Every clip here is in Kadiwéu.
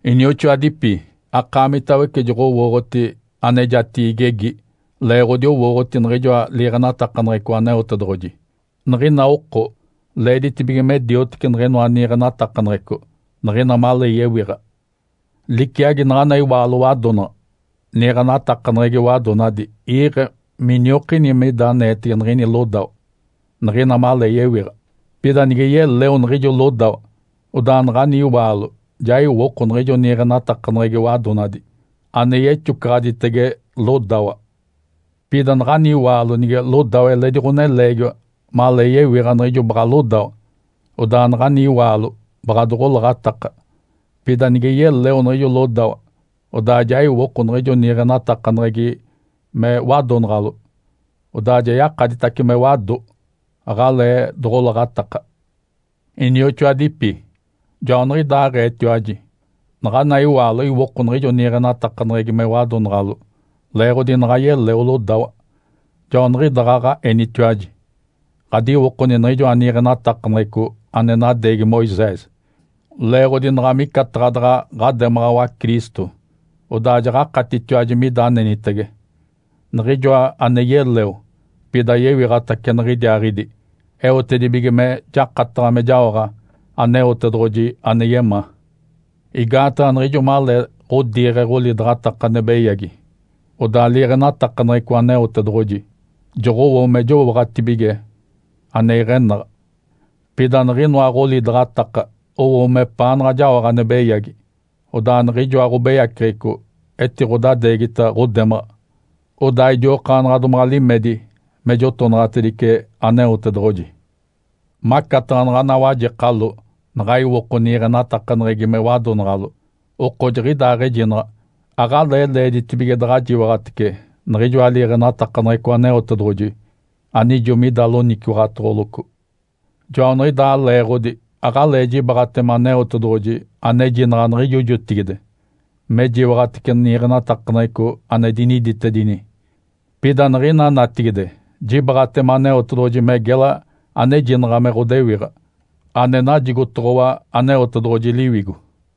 Inioxoadipi. Akaamitawece joɡ̶owooɡ̶oti anejatigi igegi leeɡ̶odi owooɡ̶oti niɡ̶ijoa liiɡ̶enatakaneɡ̶eco Aneotedoɡ̶oji. Niɡ̶ina oko leeditibige me diotece niɡ̶inoa niiɡ̶enatakaneɡ̶eco niɡ̶ina malee yewiɡ̶a. Liciagi naɡ̶ana iwaalo wadonaɡ̶a. Niiɡ̶enatakaneɡ̶egi wadonadi iiɡ̶e me iniokini mida aneetege niɡ̶ini lodawa niɡ̶ina malee yewiɡ̶a. Pida nige yeleo niɡ̶ijo lodawa, odaa naɡ̶ani iwaalo ja iwoko niɡ̶ijo niiɡ̶enatakaneɡ̶egi wadonadi ane yexocaɡ̶aditege lodawa. Pida naɡ̶ani iwaalo nige lodawa eledi ɡ̶oneleegiwa malee yewiɡ̶a niɡ̶ijo baɡ̶a lodawa, odaa naɡ̶ani iwaalo baɡ̶a doɡ̶olaɡ̶ataka. Pida nige yeleo niɡ̶ijo lodawa, odaa ja iwoko niɡ̶ijo niiɡ̶enatakaneɡ̶egi me wadonaɡ̶alo. Odaa ja yakaditace me wado, aɡ̶alee doɡ̶olaɡ̶ataka. Inioxoadipi, joaniɡ̶idaaɡ̶eetiwaji. Naɡ̶ana iwaalo iwoko niɡ̶ijo niiɡ̶enatakaneɡ̶egi me wadonaɡ̶alo, leeɡ̶odi naɡ̶a yeleo lodawa. Joaniɡ̶idaaɡ̶aɡ̶a enitiwaji ɡ̶adiwokoni niɡ̶ijoa niiɡ̶enatakaneɡ̶eco ane nadeegi Moisés, leeɡ̶odi naɡ̶a micataɡ̶a daɡ̶a ɡ̶ademaɡ̶awa Cristo. Odaa jaɡ̶akatitiwaji mida anenitege Niɡ̶ijoa ane yeleo, pida yewiɡ̶atace niɡ̶idiaaɡ̶idi, eotedibige me jakataɡ̶a me jaoɡ̶a Aneotedoɡ̶oji ane yemaa. Igaataɡ̶a niɡ̶ijo malee ɡ̶odiiɡ̶e ɡ̶olidaɡ̶ataka ane beyagi, odaa liiɡ̶enatakaneɡ̶eco Aneotedoɡ̶oji joɡ̶owo me jowooɡ̶atibige ane iɡ̶enaɡ̶a. Pida niɡ̶inoa ɡ̶olidaɡ̶ataka owo mepaanaɡ̶a jaoɡ̶a ane beyagi. Odaa niɡ̶ijoa ɡ̶obeyaceɡ̶eco etiɡ̶odadeegita ɡ̶odemaɡ̶a, odaa idiokaanaɡ̶a domaɡ̶a limedi me jotonaɡ̶atedice Aneotedoɡ̶oji. Macataɡ̶a naɡ̶ana wajekalo naɡ̶a iwoko niiɡ̶enatakaneɡ̶egi me wadonaɡ̶alo, oko jiɡ̶idaaɡ̶ejinaɡ̶a aɡ̶alee leeditibige daɡ̶a jiwaɡ̶atece niɡ̶ijoa liiɡ̶enatakaneɡ̶eco Aneotedoɡ̶oji anijo mida loniciwaɡ̶atoɡ̶oloco. Joaniɡ̶idaa leeɡ̶odi aɡ̶alee jibaaɡ̶atema Aneotedoɡ̶oji anejinaɡ̶a niɡ̶ijo jotigide me jiwaɡ̶atece niiɡ̶enatakaneɡ̶eco ane diniditedini. Pida niɡ̶ina natigide jibaaɡ̶atema Aneotedoɡ̶oji me gela anejinaɡ̶a me ɡ̶odewiɡ̶a ane najigotoɡ̶owa Aneotedoɡ̶oji Liwigo.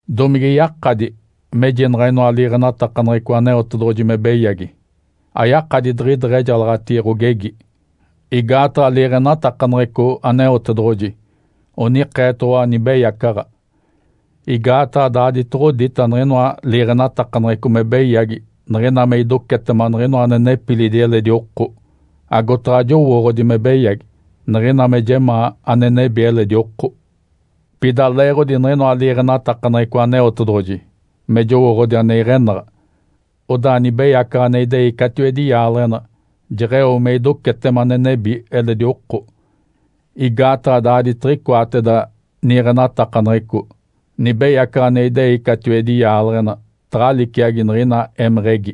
Domige yakadi mejinaɡ̶a inoa liiɡ̶enatakaneɡ̶eco Aneotedoɡ̶oji me beyagi? Ayakadi diɡ̶ideɡ̶ejalaɡ̶atigi ɡ̶ogegi! Igaataɡ̶a liiɡ̶enatakaneɡ̶eco Aneotedoɡ̶oji onikeetoɡ̶owa nibeyacaɡ̶a. Igaataɡ̶a daaditoɡ̶odita niɡ̶inoa liiɡ̶enatakaneɡ̶eco me beyagi niɡ̶ina me idocetema niɡ̶inoa ane nepilidi eledi oko. Agotaɡ̶a jowooɡ̶odi me beyagi, niɡ̶ina me jemaa ane nebi eledi oko. Pida leeɡ̶odi niɡ̶inoa liiɡ̶enatakaneɡ̶eco Aneotedoɡ̶oji (me jowooɡ̶odi ane iɡ̶enaɡ̶a), odaa nibeyacaɡ̶a ane idei catiwedi yaaleɡ̶ena jeɡ̶eo me idocetema ane nebi eledi oko. Igaataɡ̶a daaditiɡ̶icoateda niiɡ̶enatakaneɡ̶eco, nibeyacaɡ̶a ane idei catiwedi yaaleɡ̶ena taɡ̶a liciagi niɡ̶ina émeɡ̶egi.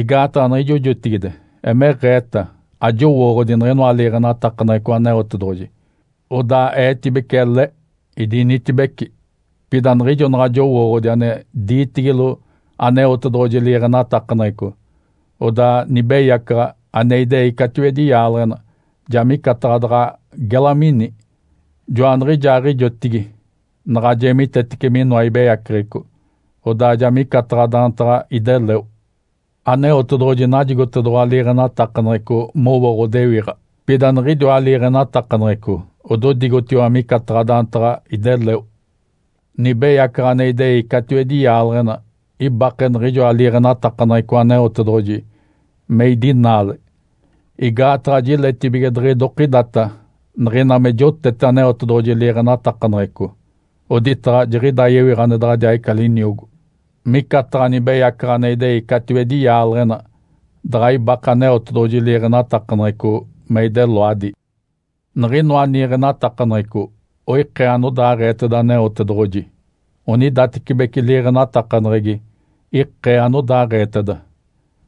Igaataɡ̶a niɡ̶ijo jotigide emeɡ̶eeta ajowooɡ̶odi niɡ̶inoa liiɡ̶enatakaneɡ̶eco Aneotedoɡ̶oji, odaa eetibece ele, idinitibeci. Pida niɡ̶ijo naɡ̶a jowooɡ̶odi ane diitigilo Aneotedoɡ̶oji liiɡ̶enatakaneɡ̶eco, odaa nibeyacaɡ̶a ane idei catiwedi yaaleɡ̶ena ja micataɡ̶a daɡ̶a gela mini, joaniɡ̶ijaaɡ̶ijotigi naɡ̶a jeemitetece minoa ibeyaceɡ̶eco. Odaa ja micataɡ̶a daantaɡ̶a ideleo. Aneotedoɡ̶oji najigotedoɡ̶owa liiɡ̶enatakaneɡ̶eco mowo ɡ̶odewiɡ̶a. Pida niɡ̶idiwa liiɡ̶enatakaneɡ̶eco ododigotiwa micataɡ̶a daantaɡ̶a ideleo. Nibeyacaɡ̶a ane idei catiwedi yaaleɡ̶ena ibake niɡ̶ijoa liiɡ̶enatakaneɡ̶eco Aneotedoɡ̶oji me idinaale. Igaataɡ̶a jiletibige diɡ̶idokidata niɡ̶ina me jotete Aneotedoɡ̶oji liiɡ̶enatakaneɡ̶eco oditaɡ̶a jiɡ̶ida yewiɡ̶a ane daɡ̶adiaaɡ̶ica liniogo. Micataɡ̶a nibeyacaɡ̶a ane idei catiwedi yaaleɡ̶ena daɡ̶a ibake Aneotedoɡ̶oji liiɡ̶enatakaneɡ̶eco me ideloadi. Niɡ̶inoa niiɡ̶enatakaneɡ̶eco oikee anodaaɡ̶eeteda Aneotedoɡ̶oji, onidatecibeci liiɡ̶enatakaneɡ̶egi ikee anodaaɡ̶eeteda.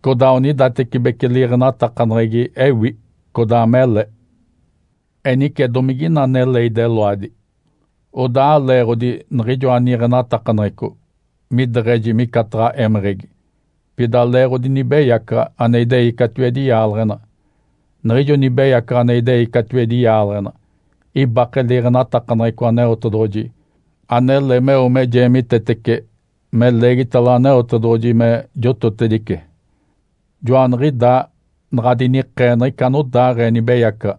Codaa onidatecibeci liiɡ̶enatakaneɡ̶egi ewi, codaa mele. Enice, domigina anele ideloadi? Odaa aleeɡ̶odi niɡ̶ijoa niiɡ̶enatakaneɡ̶eco mideɡ̶eji micataɡ̶a émeɡ̶egi, pida leeɡ̶odi nibeyacaɡ̶a ane idei catiwedi yaaleɡ̶ena. Niɡ̶ijo nibeyacaɡ̶a ane idei catiwedi yaaleɡ̶ena ibake liiɡ̶enatakaneɡ̶eco Aneotedoɡ̶oji anele meo me jeemitetece me leegitalo Aneotedoɡ̶oji me jototedice. Joaniɡ̶idaa naɡ̶a dinikee niɡ̶ica anodaaɡ̶ee nibeyacaɡ̶a.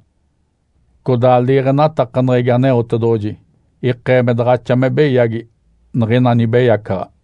Codaa liiɡ̶enatakaneɡ̶egi Aneotedoɡ̶oji ikee me daɡ̶axa me beyagi niɡ̶ina nibeyacaɡ̶a.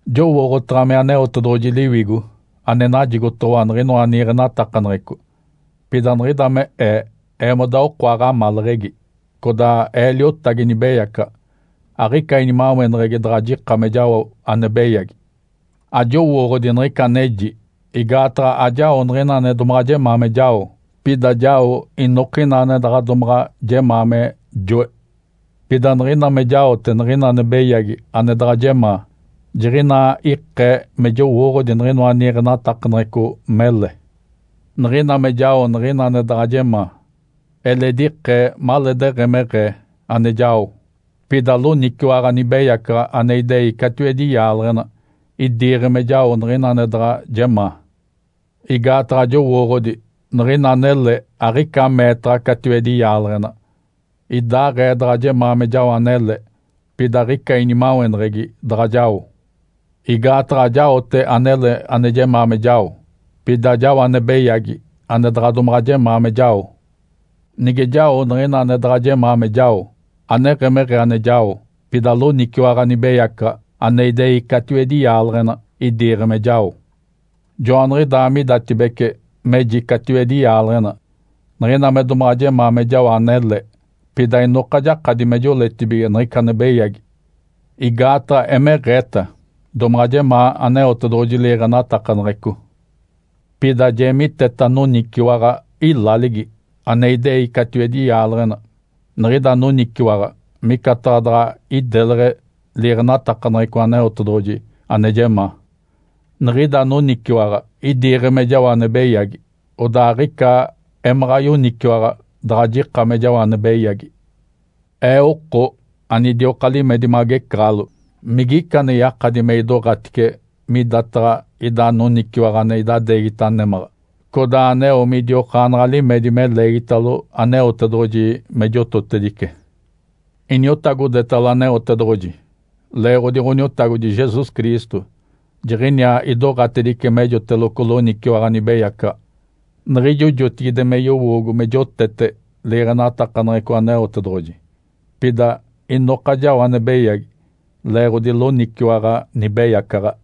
Jowooɡ̶otaɡ̶a me Aneotedoɡ̶oji Liwigo ane najigotoɡ̶owa niɡ̶inoa niiɡ̶enatakaneɡ̶eco. Pida niɡ̶ida me ee eemoda oko aɡ̶amaleɡ̶egi, codaa ee liotagi nibeyacaɡ̶a, aɡ̶ica inimaweneɡ̶egi daɡ̶a jika me jao ane beyagi. Ajowooɡ̶odi niɡ̶ica aneji. Igaataɡ̶a ajao niɡ̶ina ane jemaa me jao, pida jao inokina ane daɡ̶a domaɡ̶a jemaa me joe. Pida niɡ̶ina me jaote niɡ̶ina ane beyagi ane daɡ̶a jemaa, jiɡ̶inaa ikee me jowooɡ̶odi niɡ̶inoa niiɡ̶enatakaneɡ̶eco mele. Niɡ̶ina me jao niɡ̶ina ane daɡ̶a jemaa, eledi ikee maleedeɡ̶emeɡ̶ee ane jao, pida loniciwaɡ̶a nibeyacaɡ̶a ane idei catiwedi yaaleɡ̶ena idiiɡ̶e me jao niɡ̶ina ane daɡ̶a jemaa. Igaataɡ̶a jowooɡ̶odi niɡ̶ina anele aɡ̶ica meetaɡ̶a catiwedi yaaleɡ̶ena. Idaaɡ̶ee daɡ̶a jemaa me jao anele, pida aɡ̶ica inimaweneɡ̶egi daɡ̶a jao. Igaataɡ̶a ajaote anele ane jemaa me jao, pida jao ane beyagi ane daɡ̶a domaɡ̶a jemaa me jao. Nige jao niɡ̶ina ane daɡ̶a jemaa me jao, aneɡ̶emeɡ̶ee ane jao, pida loniciwaɡ̶a nibeyacaɡ̶a ane idei catiwedi yaaleɡ̶ena idiiɡ̶e me jao. Joaniɡ̶idaa midatibece meji catiwedi yaaleɡ̶ena. Niɡ̶ina me domaɡ̶a jemaa me jao anele, pida inoka jakadi me joletibige niɡ̶ica ane beyagi. Igaataɡ̶a emeɡ̶eeta domaɡ̶a jemaa Aneotedoɡ̶oji liiɡ̶enatakaneɡ̶eco. Pida jeemiteta noniciwaɡ̶a ilaligi, ane idei catiwedi yaaleɡ̶ena. Niɡ̶ida noniciwaɡ̶a micataɡ̶a daɡ̶a ideleɡ̶e liiɡ̶enatakaneɡ̶eco Aneotedoɡ̶oji ane jemaa. Niɡ̶ida noniciwaɡ̶a idiiɡ̶e me jao ane beyagi, odaa aɡ̶ica emaɡ̶a yoniciwaɡ̶a daɡ̶a jika me jao ane beyagi. Ee oko anidioka limedi magecaɡ̶alo! Migica ane yakadi me idoɡ̶atice midataɡ̶a ida noniciwaɡ̶a ane idadeegita némaɡ̶a, codaa aneo midiokaanaɡ̶a limedi me leegitalo Aneotedoɡ̶oji me jototedice? Iniotagodetalo Aneotedoɡ̶oji, leeɡ̶odi Ǥoniotagodi Jesus Cristo jiɡ̶iniaa idoɡ̶atedice mejoteloco loniciwaɡ̶a nibeyacaɡ̶a. Niɡ̶ijo jotigide me yowoogo me jotete liiɡ̶enatakaneɡ̶eco Aneotedoɡ̶oji. Pida inoka jao ane beyagi, leeɡ̶odi loniciwaɡ̶a nibeyacaɡ̶a.